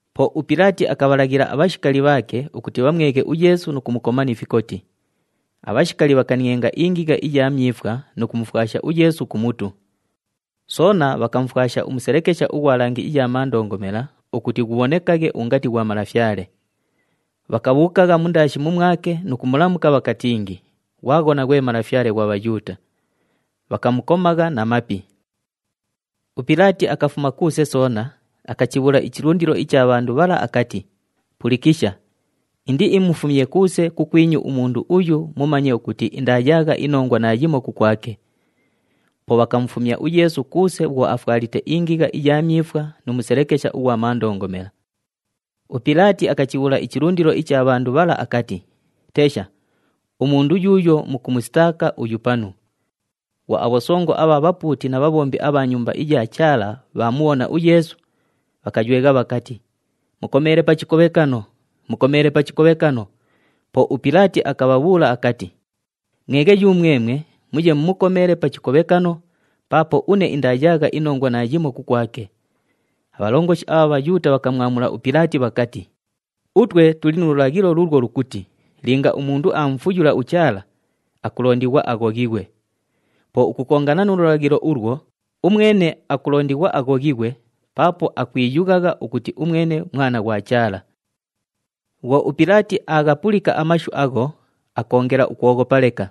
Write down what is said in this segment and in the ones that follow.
Po uPilaati akabhalaghila abhashikali bhaake ukuti bhamweghe uYeesu nu kumukoma ni fikoti. Abhashikali bhakanienga ingigha iya myifwa nu kumufwasha uYeesu ku mutu. Soona bhakamufwasha umuselekesha ughwa langi iya mandongomela ukuti ghubhonekaghe ungati ghwa malafyale. Bhakabhuukagha mundaashi mumwake nu kumulamuka bhakatingi, “Ghwaghona, ghwe Malafyale ghwa Bhayuuta!” Bhakamukomagha na mapi. UPilaati akafuma kuuse soona, akachibhuula ichilundilo icha bhandu bhala akati, “Pulikisha, indiimufumye kuuse kukwinyu umundu uyu mumanye ukuti indaayaagha inongwa naayimo kukwake.” Po bhakamufumya uYeesu kuuse bhwo afwalite ingigha iya myifwa nu muselekesha ughwa mandongomela. UPilaati akachibhuula ichilundilo icha bhandu bhala akati, “Tesha, umundu yuuyo mukumusitaaka uyu panu.” Bhwo abhosongo abha bhapuuti na bhabhombi abha Nyumba iya Chaala bhaamubhona uYeesu, bhakaywegha bhakati, “Mukomeele pa chikobhekano! Mukomeele pa chikobhekano!” Po uPilaati akabhabhuula akati, “Mweghe yumwemwe muye mumukomeele pa chikobhekano, paapo une indaayaagha inongwa naayimo kukwake.” Abhalongoshi abha Bhayuuta bhakamwamula uPilaati bhakati, “Utwe tuli nu lulaghilo luulwo lukuti linga umundu aamufuyula uChaala, akulondighwa aghoghighwe. Po ukukongana nu lulaghilo ulwo, umwene akulondighwa aghoghighwe paapo akwiyughagha ukuti umwene Mwana ghwa Chaala.” Bhwo uPilaati aaghapulika amashu agho, akoongela ukwoghopa leka.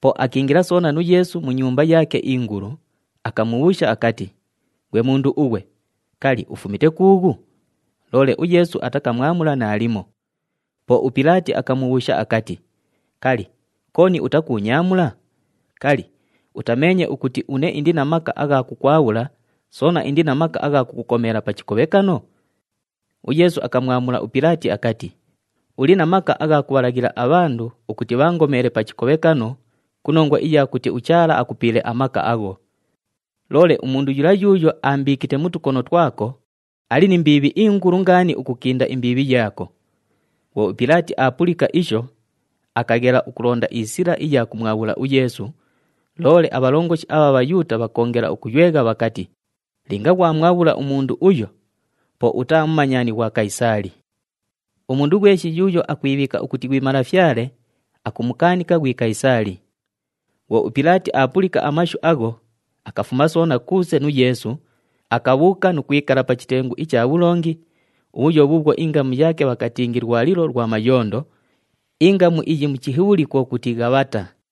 Po akiingila soona nu Yeesu mu nyumba yaake ingulu, akamubhuusha akati, “Ghwe mundu ughwe, kali, ufumite kuughu?” Loole uYeesu atakamwamula naalimo. Po uPilaati akamubhuusha akati, “Kali, kooni utakuunyaamula? Kali, utameenye ukuti une indi na maka agha kukwabhula, soona indi na maka agha kukukomeela pa chikobhekano?” UYeesu akamwamula uPilaati akati, “Uli na maka agha kubhalaghila abhandu ukuti bhaangomeele pa chikobhekano ku nongwa iya kuti uChaala akupiile amaka agho. Loole umundu yula yuuyo aambiikite mu tukono twako, ali ni mbiibhi ingulu ngaani ukukinda imbiibhi yaako.” Bhwo uPilaati aapulika isho, akaghela ukulonda isila iya kumwabhula uYeesu, loole abhalongoshi abha Bhayuuta bhakoongela ukuywegha bhakati, “Linga ghwamwabhula umundu uyo, po utaa mumanyani ghwa Kayisaali. Umundu ghweshi yuuyo akwibhiika ukuti ghwi malafyale, akumukaanika ghwi Kayisaali.” Bhwo uPilaati aapulika amashu agho, akafuma soona kuuse nu Yeesu, akabhuuka nu kwikala pa chitengu icha bhulongi, ubhuyo bhuubhwo ingamu yaake bhakatingi, “Lwalilo lwa Mayondo,” ingamu iyi mu Chihibhuli kwo kuti, “Ghabhata.”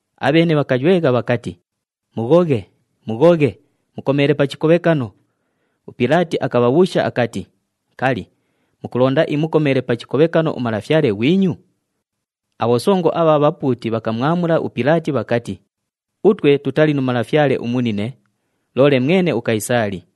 Abheene bhakaywegha bhakati, “Mughoghe! Mughoghe! Mukomeele pa chikobhekano!” UPilaati akabhabhuusha akati, “Kali, mukulonda imukomeele pa chikobhekano umalafyale ghwinyu?” Abhosongo abha bhapuuti bhakamwamula uPilaati bhakati, “Utwe tutali nu malafyale umunine, loole mwene uKayisaali!”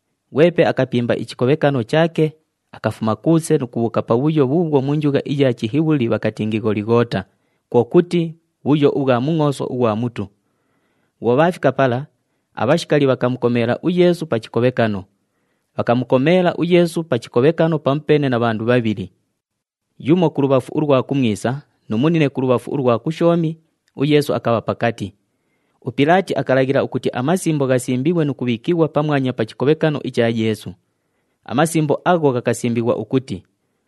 Ghwepe akapimba ichikobhekano chaake, akafuma kuuse nu kubhuuka pabhuyo bhuubhwo mu njugha iya Chihibhuli bhakatingi Gholighoota, kwo kuti, “Bhuyo ubhwa Mungʼooso ughwa Mutu.” Bhwo bhaafika pala, abhashikali bhakamukomeela uYeesu pa chikobhekano. Bhakamukomeela uYeesu pa chikobhekano pamupeene na bhandu bhabhili. Yumo kulubhafu ulwa kumwisa nu munine kulubhafu ulwa kushoomi, uYeesu akabha pakati. UPilaati akalaghila ukuti amasimbo ghasimbighwe nu kubhiikighwa pamwanya pa chikobhekano icha Yeesu. Amasimbo agho ghakasimbighwa ukuti,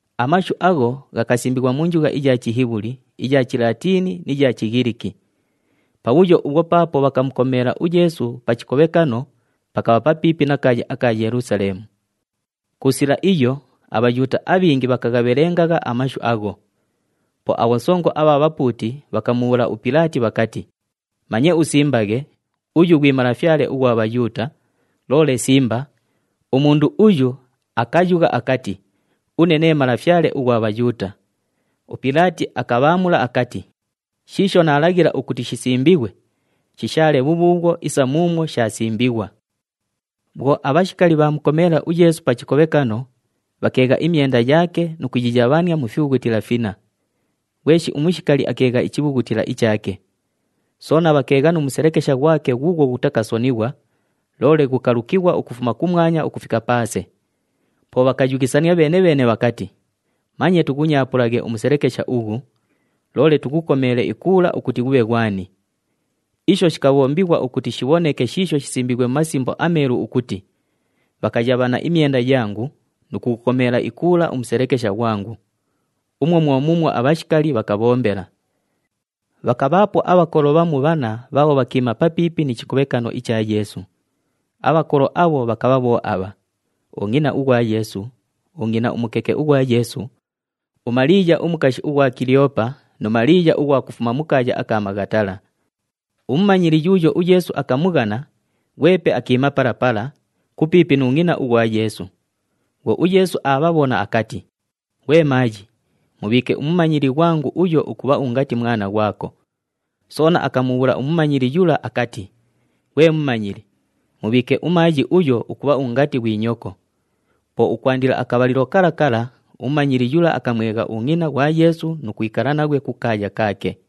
Amashu agho ghakasimbighwa mu njugha iya Chihibhuli, iya Chilatiini ni ya Chighiliki. Pabhuyo ubhwo paapo bhakamukomeela uYeesu pa chikobhekano, pakabha papiipi na kaaya aka Yelusaleemu. Ku sila iyo aBhayuuta abhingi bhakaghabhelengagha amashu agho. Po abhosongo abha bhapuuti bhakamubhuula uPilaati bhakati, “Manye usimbaghe, ‘Uyu ghwi Malafyale ughwa Bhayuuta,’ loole simba, ‘Umundu uyu akayugha akati, Une nee Malafyale ughwa Bhayuuta.’” UPilaati akabhaamula akati, “Shiisho naalaghila ukuti shisimbighwe, shishaale bhubhuubhwo isa muumwo shaasimbighwa.” Bhwo abhashikali bhaamukomeela uYeesu pa chikobhekano, bhakeegha imyenda yaake nu kuyiyabhania mu fibhughutila finna. Ghweshi umushikali akeegha ichibhughutila ichaake. Soona bhakeegha nu muselekesha ghwake ghuughwo ghutakasonighwa, loole ghukalukighwa ukufuma kumwanya ukufika paase. Po bhakayughisania bheene-bheene bhakati, “Manye tughunyaapulaghe umuselekesha ughu, loole tughukomele ikuula ukuti ghubhe ghwani.” Isho shikabhombighwa ukuti shibhoneke shiisho shisimbiighwe mu Masimbo aMeelu ukuti, “Bhakayabhana imyenda yangu, nu kughukomela ikuula umuselekesha ghwangu.” Umwo mwo muumwo abhashikali bhakabhombela. Bhakabhaapo abhakolo bhamu bhanna bhaabho bhakiima papiipi ni chikobhekano icha Yeesu. Abhakolo abho bhakabha bho abha: ungʼina ughwa Yeesu, ungʼina umukeke ughwa Yeesu, uMaliiya umukashi ughwa Kiliyoopa nu Maliiya ughwa kufuma mu kaaya aka Maghatala. Umumanyili yuuyo uYeesu akamughana, ghwepe akiima pala pala, kupiipi nu ngʼina ughwa Yeesu. Bhwo uYeesu aabhabhona akati, “Ghwe maayi, mubhiike umumanyili ghwangu uyo ukubha ungati mwana ghwako.” Soona akamubhuula umumanyili yula akati, “Ghwe mumanyili, mubhiike umaayi uyo ukubha ungati ghwi nyoko.” Po ukwandila akabhalilo kala kala umumanyili yula akamwegha ungʼina ghwa Yeesu nu kwikala naghwe kukaaya kaake.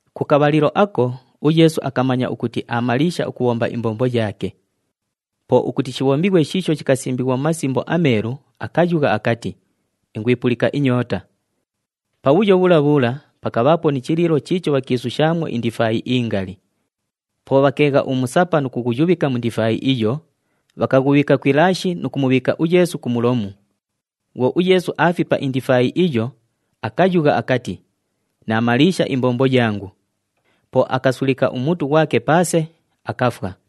Ku kabhalilo ako uYeesu akamanya ukuti aamaliisha ukubhomba imbombo yaake. Po ukuti shibhombighwe shiisho shikasimbighwa mu Masimbo aMeelu, akayugha akati, “Ingwipulika inyoota.” Pabhuyo bhula bhula pakabhaapo ni chiliilo chiicho bhakiisushaamwo indifaayi ingali. Po bhakeegha umusapa nu kughuyubhika mu ndifaayi iyo, bhakaghubhiika ku ilaashi nu kumubhiika uYeesu ku mulomu. Bhwo uYeesu aafipa indifaayi iyo, akayugha akati, “Naamaliisha imbombo yangu!” Po akasulika umutu ghwake paase, akafwa.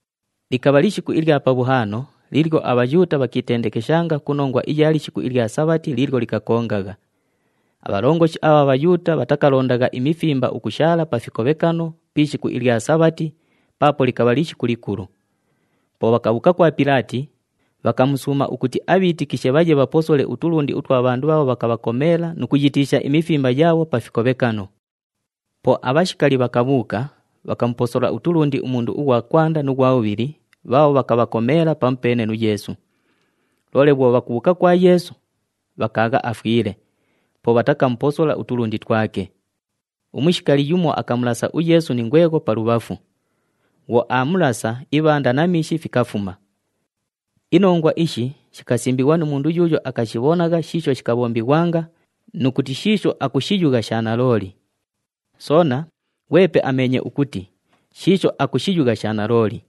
Likabha lishiku ilya Pabhuhaano liilyo aBhayuuta bhakiitendekeshanga ku nongwa iya lishiku ilya Sabhati liilyo likakongagha. Abhalongoshi abha Bhayuuta bhatakalondagha imifimba ukushaala pa fikobhekano pi ishiku ilya Sabhati paapo likabha lishiku likulu. Po bhakabhuuka kwa Pilaati, bhakamusuuma ukuti abhiitikishe bhaye bhaposole utulundi utwa bhandu bhaabho bhakabhakomeela nu kuyitiisha imifimba yaabho pa fikobhekano. Po abhashikali bhakabhuuka, bhakamuposola utulundi umundu ughwa kwanda nu ghwa bhubhili bhaabho bhakabhakomeela pamupeene nu Yeesu. Loole bhwo bhakubhuuka kwa Yeesu, bhakaagha afwile, po bhatakamuposola utulundi twake. Umushikali yumo akamulasa uYeesu ni ngwegho pa lubhafu. Bhwo aamulasa, ibhanda na miishi fikafuma. Inongwa ishi shikasimbighwa nu mundu yuuyo akashibhonagha shiisho shikabhombighwanga nu kuti shiisho akushiyugha sha nalooli. Soona, ghwepe ameenye ukuti shiisho akushiyugha sha nalooli.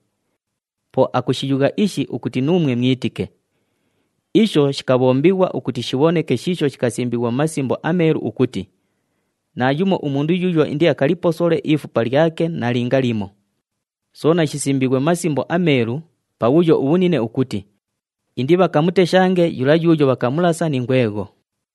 Po akushiyugha ishi ukuti nuumwe mwitike. Isho shikabhombighwa ukuti shibhoneke shiisho shikasimbighwa mu Masimbo aMeelu ukuti, “Naayumo umundu yuuyo indiakaliposole ifupa lyake nalinga limo.” Soona shisimbiighwe mu Masimbo aMeelu, pabhuyo ubhunine ukuti, “Indibhakamuteshange yula yuuyo bhakamulasa ni ngwegho.”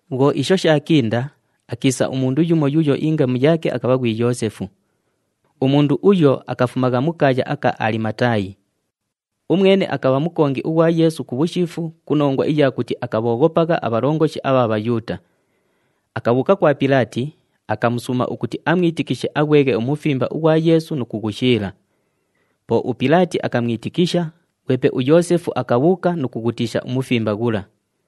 Bhwo isho shaakinda, akiisa umundu yumo yuuyo ingamu yaake akabha ghwi Yoosefu. Umundu uyo akafumagha mu kaaya aka Alimataayi. Umwene akabha mukongi ughwa Yeesu (ku bhushiifu ku nongwa iya kuti akabhooghopagha abhalongoshi abha Bhayuuta). Akabhuuka kwa Pilaati, akamusuuma ukuti amwitikishe aghweghe umufimba ughwa Yeesu nu kughushiila. Po uPilaati akamwitikisha, ghwepe uYoosefu akabhuuka nu kughutiisha umufimba ghula.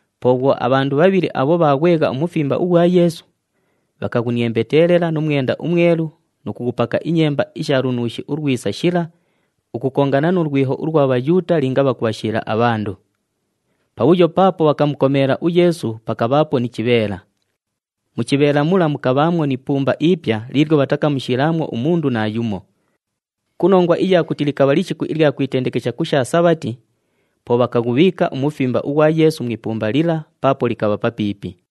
Po bhwo abhandu bhabhili abho bhaaghwegha umufimba ughwa Yeesu, bhakaghuniembetelela nu mwenda umwelu nu kughupaka inyemba isha lunuushi ulwisa shila ukukongana nu lwiho ulwa Bhayuuta linga bhakubhashiila abhandu. Pabhuyo paapo bhakamukomeela uYeesu pakabhaapo ni chibheela. Mu chibheela mula mukabhaamwo ni ipumba ipya liilyo bhatakamushiilaamwo umundu naayumo. Ku nongwa iya kuti likabha lishiku ilya kwitendekesha ku sha Sabhati, po bhakaghubhiika umufimba ughwa Yeesu mu ipumba lila paapo likabha papiipi.